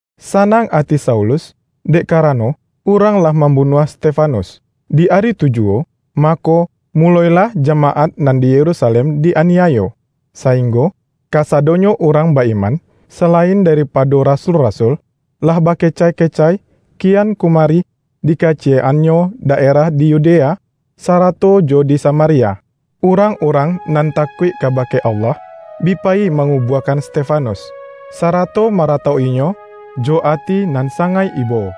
Sanang ati Saulus, dek karano urang lah mambunuah Stefanus. Di ari tu juwo, mako, muloilah jamaat nan di Yerusalem di-aniayo, sainggo kasadonyo urang ba-iman, salain daripado rasul-rasul, lah bakecai-kecai kian kumari di kaciyek-annyo daerah di Yudea sarato jo di Samaria. Urang-urang nan takuik kabake Allah, bi payi mangubuakan Stefanus, sarato maratok-inyo jo ati nan sangaik ibo.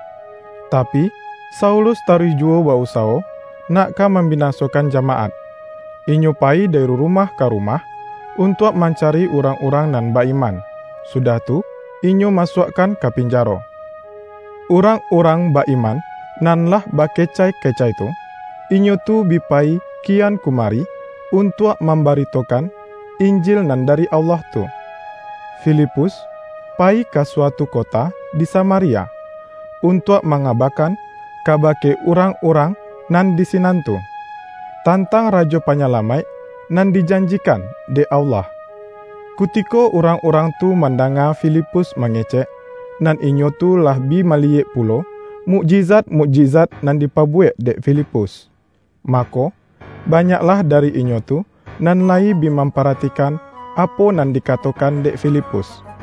Tapi, Saulus taruih juwo ba-usawo, nak ka mambinasokan jamaat. Inyo payi dari rumah ka rumah, untuak mancari urang-urang nan ba-iman, sudah tu, inyo masuakkan ka pinjaro. Urang-urang ba-iman nan lah bakecai-kecai tu, inyo tu bi payi kian kumari untuak mambaritokan Injil nan dari Allah tu. Filipus payi ka suatu kota di Samaria, untuak mangabakan kabake urang-urang nan di sinan tu, tantang Rajo Panyalamaik nan dijanjikan dek Allah. Kutiko urang-urang tu mandanga Filipus mangecek, nan inyo tu lah bi maliyek pulo mukjizat-mukjizat nan dipabuwek dek Filipus, mako, banyaklah dari inyo tu nan layi bi mamparatikan apo nan dikatokan dek Filipus.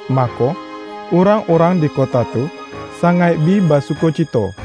Mako, urang-urang di kota tu sangaik bi basukocito.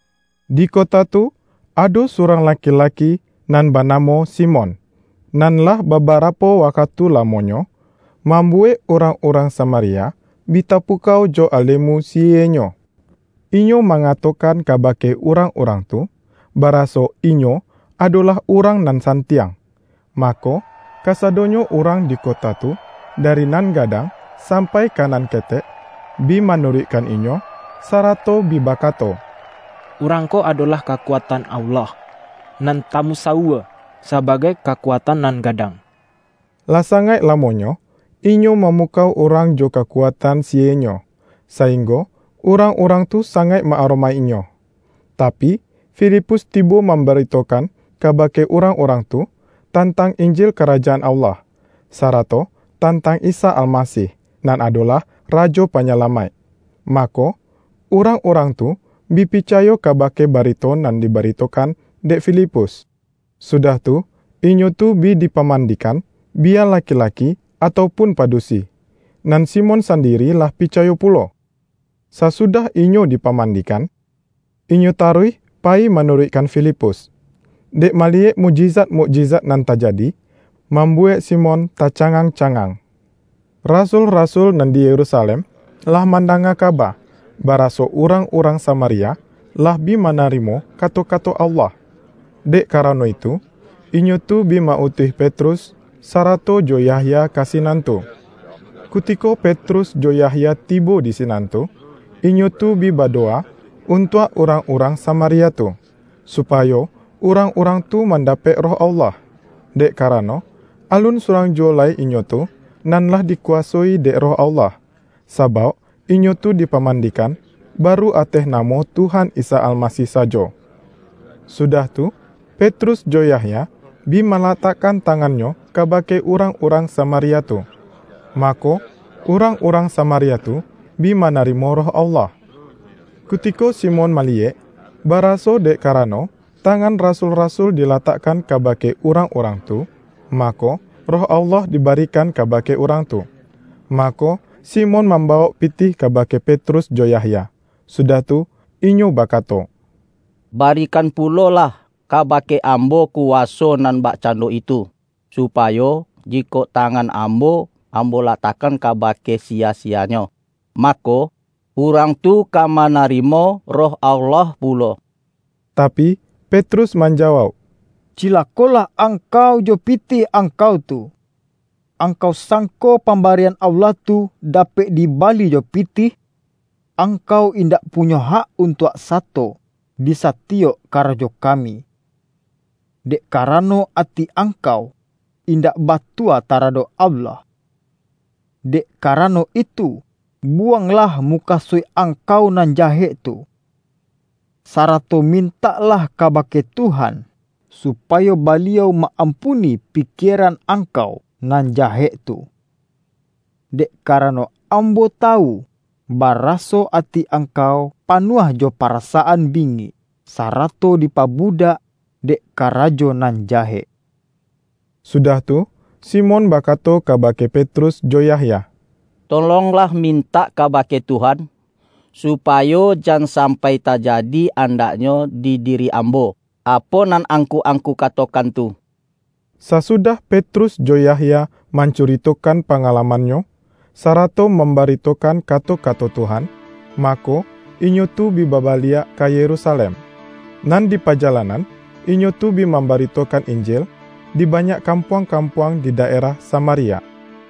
Di kota tu ado surang laki-laki nan banamo Simon, nan lah babarapo wakatu lamonyo, mambuwek urang-urang Samaria bi tapukau jo ale-mu sihienyo. Inyo mangatokan ka-bake urang-urang tu, baraso inyo adolah urang nan santiang. Mako, kasadonyo urang di kota tu, dari nan gadang sampai ka nan ketek, bi manuruikkan inyo, sarato bi bakato,”Urang ko adolah kakuatan Allah, nan tamusawua sabagai ’Kakuatan Nan Gadang.’” Lah sangaik lamonyo, inyo mamukau urang jo kakuatan sihienyo, sainggo urang-urang tu sangaik ma-aromaik-inyo. Tapi, Filipus tibo mambaritokan kabake urang-urang tu, tantang Injil Karajaan Allah, sarato tantang Isa Almasih, nan adolah Rajo Panyalamaik. Mako, urang-urang tu bi picayo kabake barito nan dibaritokan dek Filipus, sudah tu, inyo tu bi dipamandikan, biya laki-laki atau pun padusi. Nan Simon sandiri lah picayo pulo. Sasudah inyo dipamandikan, inyo taruih payi manuruikkan Filipus. Dek maliyek mukjizat-mukjizat nan tajadi, mambuwek Simon tacangang-cangang. Rasul-rasul nan di Yerusalem lah mandanga kaba, baraso urang-urang Samaria lah bi manarimo kato-kato Allah. Dek karano itu, inyo tu bi ma-utuih Petrus, sarato jo Yahya ka sinan tu. Kutiko Petrus jo Yahya tibo di sinan tu, inyo tu bi badowa untuak urang-urang Samaria tu, supayo urang-urang tu mandapek Roh Allah, dek karano, alun surang juwo lai inyo tu, nan lah dikuwasoi dek Roh Allah; sabauk inyo tu dipamandikan, baru ateh namo Tuhan Isa Almasih sajo. Sudah tu, Petrus jo Yahya, bi malatakkan tangannyo kabake urang-urang Samaria tu; mako, urang-urang Samaria tu bi manarimo Roh Allah. Kutiko Simon maliyek, baraso, dek karano tangan rasul-rasul dilatakkan kabake urang-urang tu, mako, Roh Allah dibarikan kabake urang tu. Mako, Simon mambawok pitih kabake Petrus jo Yahya, sudah tu, inyo bakato,”Barikan pulolah kabake ambo kuwaso nan bakcando itu, supayo, jikok tangan ambo, ambo latakkan kabake siya-siyanyo, mako, urang tu ka manarimo Roh Allah pulo.” Tapi, Petrus manjawauk,”Cilako-lah angkau jo pitih angkau tu! Angkau sangko pambarian Allah tu dapek dibali jo pitih? Angkau indak punyo hak untuak sato di satiyok karajo kami, dek karano, ati angkau indak batua taradok Allah. Dek karano itu, buwanglah mukasuik angkau nan jahek tu, sarato mintaklah kabake Tuhan, supayo Baliau ma-ampuni pikieran angkau nan jahek tu! Dek karano ambo tawu, baraso ati angkau panuah jo parasaan bingik, sarato dipabudak dek karajo nan jahek.” Sudah tu, Simon bakato kabake Petrus jo Yahya,”Tolonglah mintak kabake Tuhan, supayo jan sampai tajadi andaknyo di diri ambo, apo nan angku-angku katokan tu.” Sasudah Petrus jo Yahya man-curitokan pangalamannyo, sarato mambaritokan kato-kato Tuhan, mako, inyo tu bi babaliak ka Yerusalem. Nan di pajalanan, inyo tu bi mambaritokan Injil, di banyak kampuang-kampuang di daerah Samaria.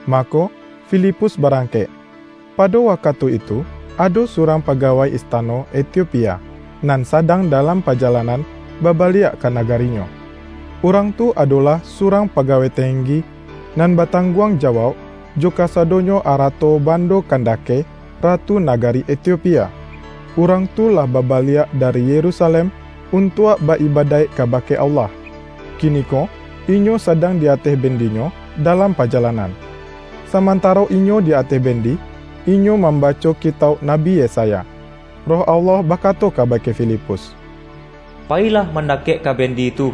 Mako, Filipus barangkek. Pado wakatu itu ado surang pagawai istano Etiopia, nan sadang dalam pajalanan babaliak ka nagarinyo. Urang tu adolah surang pagawai tenggi, nan batangguang jawauk jo kasadonyo arato bando Kandake, ratu nagari Etiopia. Urang tu lah babaliak dari Yerusalem untuak ba-ibadaik kabake Allah, kiniko inyo sadang di ateh bendinyo dalam pajalanan. Samantaro inyo di ateh bendi, inyo mambaco Kitauk Nabi Yesaya. Roh Allah bakato kabake Filipus,”Payilah mandakek ka bendi tu.”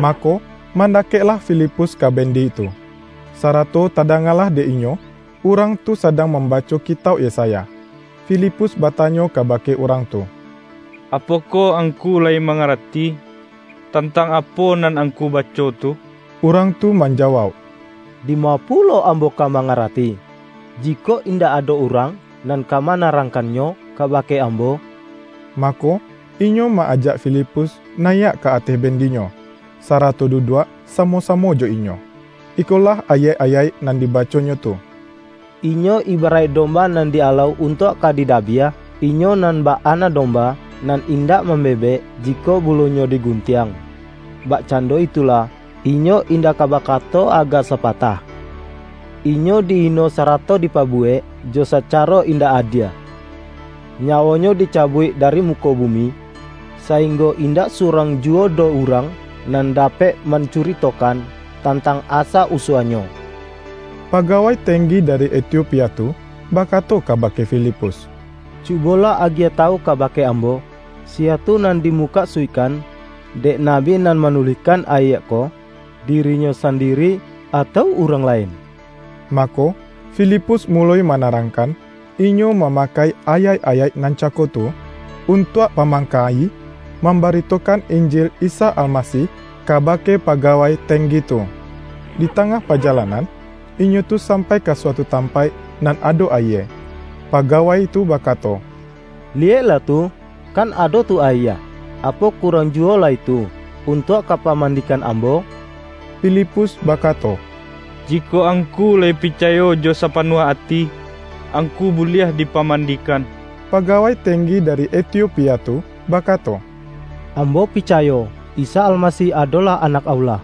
Mako, mandakeklah Filipus ka bendi tu, sarato tadangalah dek inyo urang tu sadang mambaco Kitauk Yesaya. Filipus batanyo kabake urang tu,”Apokoh angku layi mangarati, tantang apo nan angku baco tu?” Urang tu manjawauk,”Dima pulo ambo ka mangarati, jikok indak ado urang nan ka manarangkannyo kabake ambo?” Mako, inyo ma-ajak Filipus nayiak ka ateh bendinyo, sarato duduak samo-samo jo inyo. Ikolah ayaik-ayaik nan dibaconyo tu,”Inyo ibaraik domba nan di-alau untuak ka didabiah, Inyo nan bak anak domba, nan indak mambebek, jikok bulunyo diguntiang, bakcando itulah, Inyo indak ka bakato agak sapatah. Inyo di-ino sarato dipabuwek jo sacaro indak adie. Nyawo-Nyo dicabuik dari muko bumi, sainggo indak surang juwo doh urang, nan dapek mancuritokan tantang asa-usua-Nyo.” Pagawai tenggi dari Etiopia tu bakato kabake Filipus,”Cubolah agiah tawu kabake ambo, siya tu nan dimukasuikkan dek nabi nan manulihkan ayaik ko? Dirinyo sandiri atau urang lain?” Mako, Filipus muloi manarangkan; inyo mamakai ayaik-ayaik nan cako tu, untuak pamangka-i, mambaritokan Injil Isa Almasih kabake pagawai tenggi tu. Di tangah pajalanan, inyo tu sampai ka suatu tampaik nan ado ayie. Pagawai tu bakato,”Liyeklah tu, kan ado tu ayie! Apo kurang juwo lai tu, untuak ka mampamandikan ambo?” Filipus bakato,”Jikok angku layi picayo jo sapanuah ati, angku buliah dipamandikan.” Pagawai tenggi dari Etiopia tu, bakato,”Ambo picayo, Isa Almasih adolah Anak Allah.”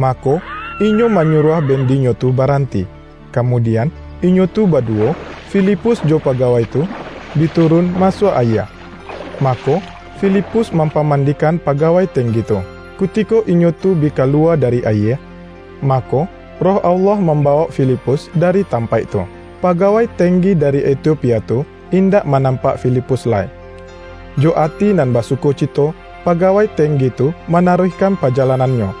Mako, inyo manyuruah bendinyo tu baranti; kamudian, inyo tu baduwo, Filipus jo pagawai tu, bi turun masuak ayie, mako, Filipus mampamandikan pagawai tenggi tu. Kutiko inyo tu bi kaluwa dari ayie, mako, Roh Allah mambawok Filipus dari tampaik tu. Pagawai tenggi dari Etiopia tu, indak manampak Filipus lai. Jo ati nan basukocito, pagawai tenggi tu manaruihkan pajalanannyo.